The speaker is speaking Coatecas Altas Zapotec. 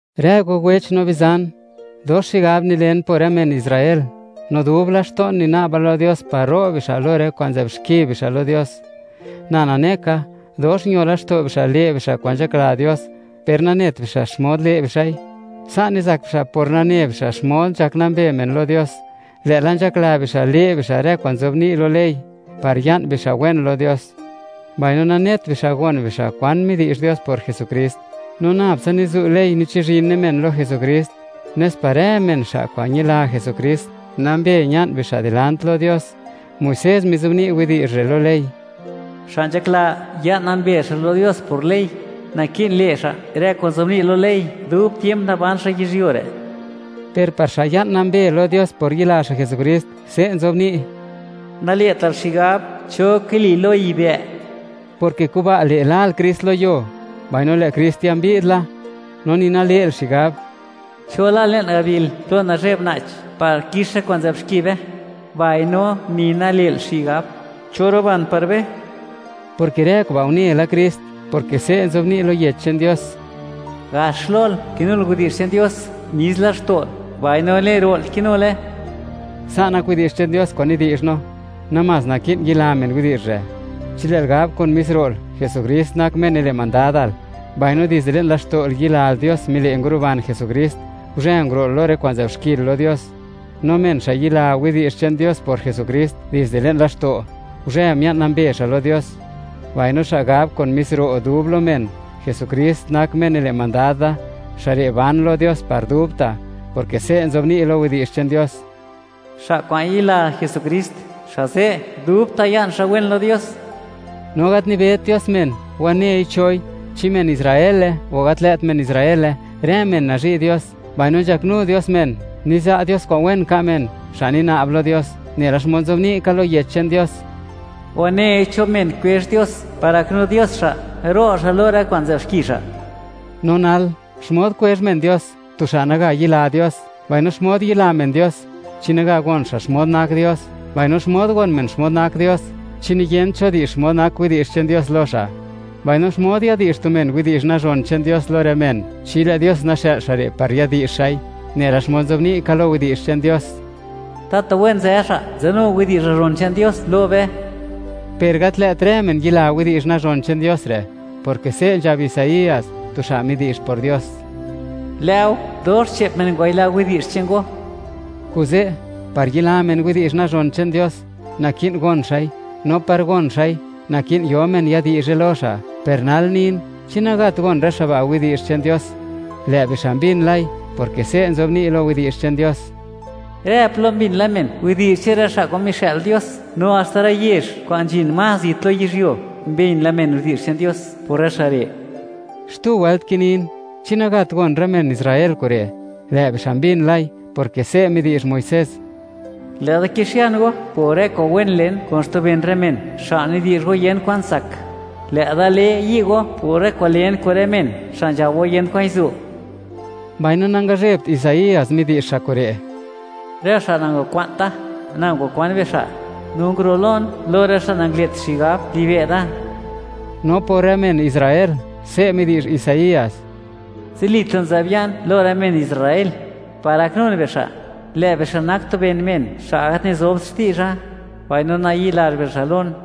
Rë go wech no bizan, dox xigab nilen por rë men Israel, no dub laxto'n nina'ba lo Dios par ro' bixa' lo rë kwa'n nzë'b xki bixa' lo Dios. Na nane ka, dox ño laxto' bixa' le' bixa' kwa'n nzhakla Dios, per nanet bixa' xmod le' bixa'i. Sa' nizak bixa' por nane bixa' xmod nzhak nambe men lo Dios, lë'la nzhakla bixa' le' bixa' rë kwa'n nzobni' lo ley, par ya'n bixa' wen lo Dios. Mbaino nanet bixa' gon bixa' kwan midi'zh Dios por Jesukrist. No nab tsa nizu' ley nichizhine men lo Jesukrist, nes par rë men xa' kwa'n ñila Jesukrist, nambe ña'n bixa' dilant lo Dios. Muisés mizobni' widi'zh re' lo ley: “Xa' nzhakla ya'n nambe xa' lo Dios por ley, naki'n le' xa' rë kwa'n nzobni' lo ley dub tiemp naban xa' yizhyuo re'.” Per par xa' ya'n nambe lo Dios por yila xa' Jesukrist, se' nzobni': “Nale'tal xigab: ¿Cho kili lo yibë'?” (porke kuba' le', lal Krist lo yuo, mbaino lë' Krist ya mbi'd la). No ni nale'l xigab: “¿Cho la le'n gabil plo nazhe'b na'ch, par kix rë kwa'n nzë'b xki be?”, mbaino ni nale'l xigab: “¿Cho ruban par be?” (porke rë kuba' une la Krist), porke se' nzobni' lo Yech che'n Dios: “Gax lol kinul widi'zh che'n Dios, mis laxto'l; mbaino le'n ro'l kinule.” Sa' nak widi'zh che'n Dios kwa'n nidi'zh no; namás naki'n yila men widi'zh re'. Chi lë'l gab kun mis ro'l, Jesukrist nak Me nile' mandadal, mbaino dizde le'n laxto'l, yilal Dios mile' nguruban Jesukrist, guzhë nguro'l lo rë kwa'n nzë'b xkil lo Dios. No men xa' yila widi'zh che'n Dios por Jesukrist dizde le'n laxto', guzhë mia'n nambe xa' lo Dios; mbaino xa' gab kun mis ro' dub lo men: “Jesukrist nak Me nile' mandad da”, xa' re' ban lo Dios par dubta', porke se' nzobni' lo Yech che'n Dios: “Xa' kwa'n yila Jesukrist, xa' ze' dubta' ya'n xa' wen lo Dios.” No gat nibet Dios men, wanei choi, chi men Israele o gat lë't men Israele; rë men nazhi' Dios; mbaino nzhaknu Dios men, niza' Dios kwa'n wen ka' men, xa' nina'b lo Dios. Nela xmod nzobni' ka lo Yech che'n Dios: “Wanei cho men kwezh Dios par gaknu Dios xa', ro' xa' lo rë kwa'n nzë'b xki xa'.” No nal, ¿xmod kwezh men Dios, tu xa' naga yila Dios? Mbaino, ¿xmod yila men Dios, chi naga gon xa' xmod nak Dios? Mbaino, ¿xmod gon men xmod nak Dios, chi niyent cho di'zh xmod nak widi'zh che'n Dios lo xa'? Mbaino, ¿xmod yadi'zh tu men widi'zh nazhon che'n Dios lo rë men chi lë' Dios naxë'l xa' re' par yadi'zh xa'i? Nela xmod nzobni' ka lo Yech che'n Dios: “¡Tatu wen nzë xa' nzadnu widi'zh nazhon che'n Dios lo be!” Per gat lë't rë men yila widi'zh nazhon che'n Dios re', porke se' nzhab Isaías, tu xa' midi'zh por Dios: “Lë'o, dox che'p men ngwayila widi'zh che'n Go.” Kuze', par yila men widi'zh nazhon che'n Dios, naki'n gon xa'i; no par gon xa'i, naki'n yo men yadi'zhe lo xa'. Per nal nin, ¿chi nagat gon rë xa' ba' widi'zh che'n Dios? ¡Lë' bixa' mbin lai!, porke se' nzobni' lo Yech che'n Dios: Rë plo mbin la men widi'zh che'n rë xa' kwa'n mixë'l Dios, no haxta rë yezh kwa'n nzhin más zit lo yizhyuo mbin la men widi'zh che'n Dios por rë xa' re'. Xtu wëlt kinin: ¿Chi nagat gon rë men Israel kure'? Lë' bixa' mbin lai, porke se' midi'zh Muisés: Lë'da kixian go por rë kwa'n wen len kun xtu ben rë men, xa' nidi'zh go, yent kwan tsak. Lë' da le yi' go por rë kwa'n len kun rë men xa' nzhab go, yent kwan zu'. Mbaino nangazhebt Isaías midi'zh xa' kure': Rë xa' nangakwa'nt Da, Na ngwakwan bixa'; no nguru'lon lo rë xa' nangale't xigab libe' Da. No por rë men Israel, se' midi'zh Isaías: Zilita' nzë'b ya'n lo rë men Israel, par gaknun bixa'. Lë' bixa' nak tu ben men xa' gat nizobt xti'zha, mbaino nayi'lazh bixa' lon.